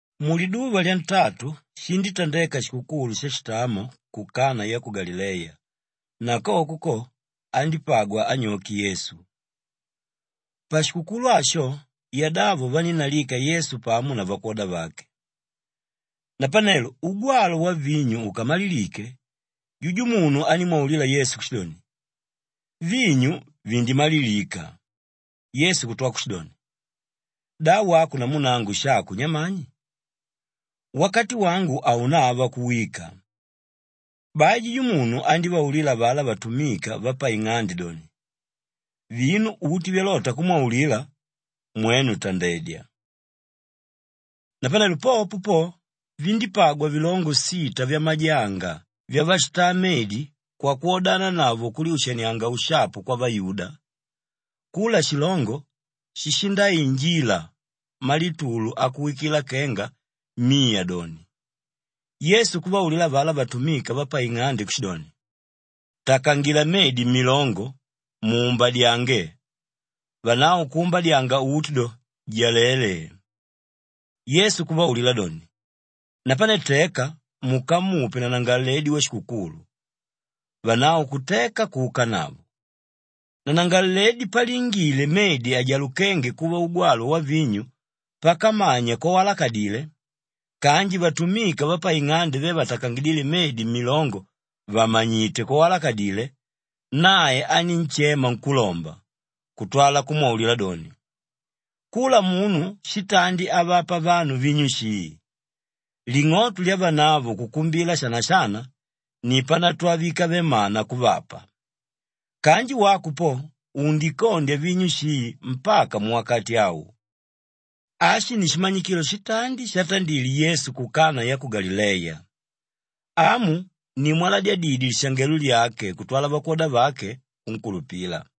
Muliduva lyantatu shindítandeka shikukulu shashitamo ku Kanaa ya ku Galileya na koko ko, andípagwa anyoke Yesu. Pashikukulu asho yadavo vanínnalika Yesu pamo na vakwoda vake. Napanelo ugwalwa wavinyu ukamalilike, jujumunu anímwaulila Yesu kushidoni, “Vinyu vindimalilika.” Yesu kutwa kushidoni, “Da wako namu nangu shako nyamani? Wakati wangu haunava kuwika.” Bai jujumunu andívaulila avalá vatumika vapaing'ande doni, “Vinu uti vyalota kumwaulila, mwenu tandedya.” Napanelo popo po, vindípagwa vilongo sita vyamajanga vyavashitaa medi kwakwodananavo kulyushanianga ushapu kwavayuda. Kula shilongo shishindainjila malitulu akuwikila kenga miya doni. Yesu kuvaulila avalá vatumika vapaing'ande kushidoni, “Takangila medi mmilongo muumbadyange.” Vanavo kuumbadyanga uti do, jalele! Yesu kuvaulila doni, “Napane teka mukamupe nanangalaledi washikukulu.” Vanavo kuteka kuukanavo. Nanangalaledi palingile medi ajalukénge kuva ugwalwa wavinyu pakamanya kwawalakadile kanji vatumika vapaing'ande ve vatakangidíle medi mmilongo vàmanyite kwawalakadile, nae anínshema nkúlomba kutwala kumwaulila doni, “Kula munu shitandi avapa vanu vinyu shii, ling'oto lyavanavo kukumbila shana-shana ni panatwala víkave mana kuvapa. Kanji wako po undikondya vinyu shii mpaka muwakati au!” Ashi ni shimanyikilo shitandi shatandile Yesu ku Kanaa ya ku Galileya. Amu ni mwalaladidye lishangelo lyake kutwala vakwoda vake kunkulupila.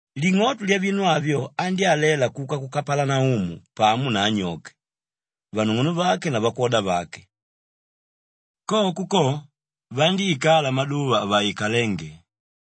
Ling'oto lyavinu avyo andyálela kuka ku Kapalanaumu pamo na anyoke, vanung'unuvake na vakwoda vake. Koko ko, vandíikala maduva avaikalénge.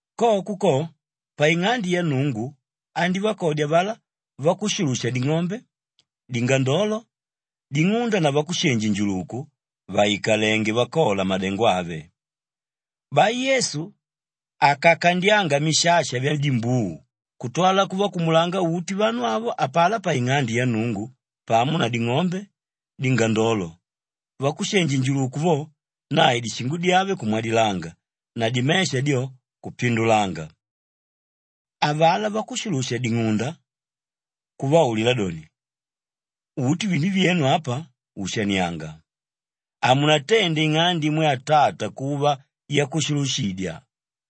Koko ko, paing'ande ya Nnungu andívakodya avalá vakushulusha-ding'ombe, dingandolo, ding'unda na vakushenji-njuluku vàikalenge vakola madengo ave. Bai Yesu akakandyanga mishasha vyadimbuu kutwala kuvakumulanga uti vanu avo apalá paing'ande ya Nnungu pamo na ding'ombe, dingandolo; vakushenji-njuluku vo, nae dishingo dyave kumwadilanga na dimesha dyo, kupindulanga. Avalá vakushulusha-ding'unda kuvaulila doni, “Uti vinu vyenu apa ushanianga! Hamunatende ing'ande imwe Atata kuva yakushulushidya!”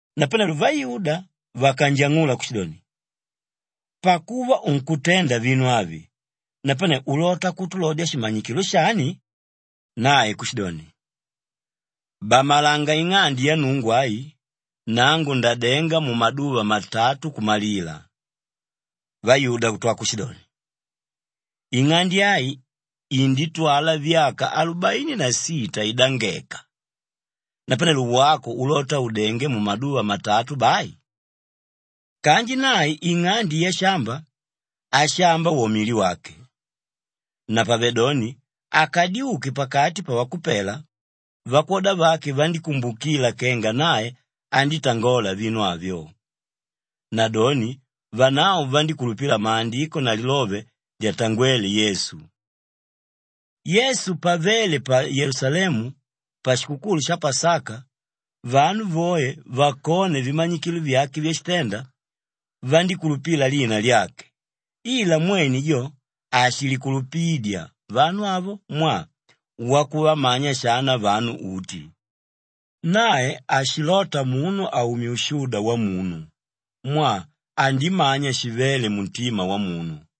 Napanelo vayuda vakanjang'ula kushidoni, “Pakuva unkutenda vinu avi, napane ulota kutulodya shimanyikilo shani?” Nae kushidoni, “Bamalanga ing'ande ya Nnungu ai, nangu ndadenga mumaduva matatu kumalila.” Vayuda kutwa kushidoni, “Ing'ande ai inditwala vyaka alubaini na sita idangeka! Napanelo wako ulota udenge mumaduva matatu bai?” Kanji nae ing'ande yashamba, ashamba wo mili wake. Napavedoni akadyuke pakati pavakupela, vakwoda vake vandíkumbukila kenga nae andítangola vinu avyo. Nadoni vanavo vandíkulupila Maandiko na lilove lyatangwéle Yesu. Yesu pavéle pa Yelusalemu pashikukulu sha Pasaka, vanu voe vakone vimanyikilo vyake vyashitenda, vandíkulupila lina lyake ila mwene jo hashilikulupidya vanu avo mwaa wakuvamanya shana vanu uti. Nae hashilota munu aumye ushuda wamunu mwaa andimanya shivéle muntima wamunu.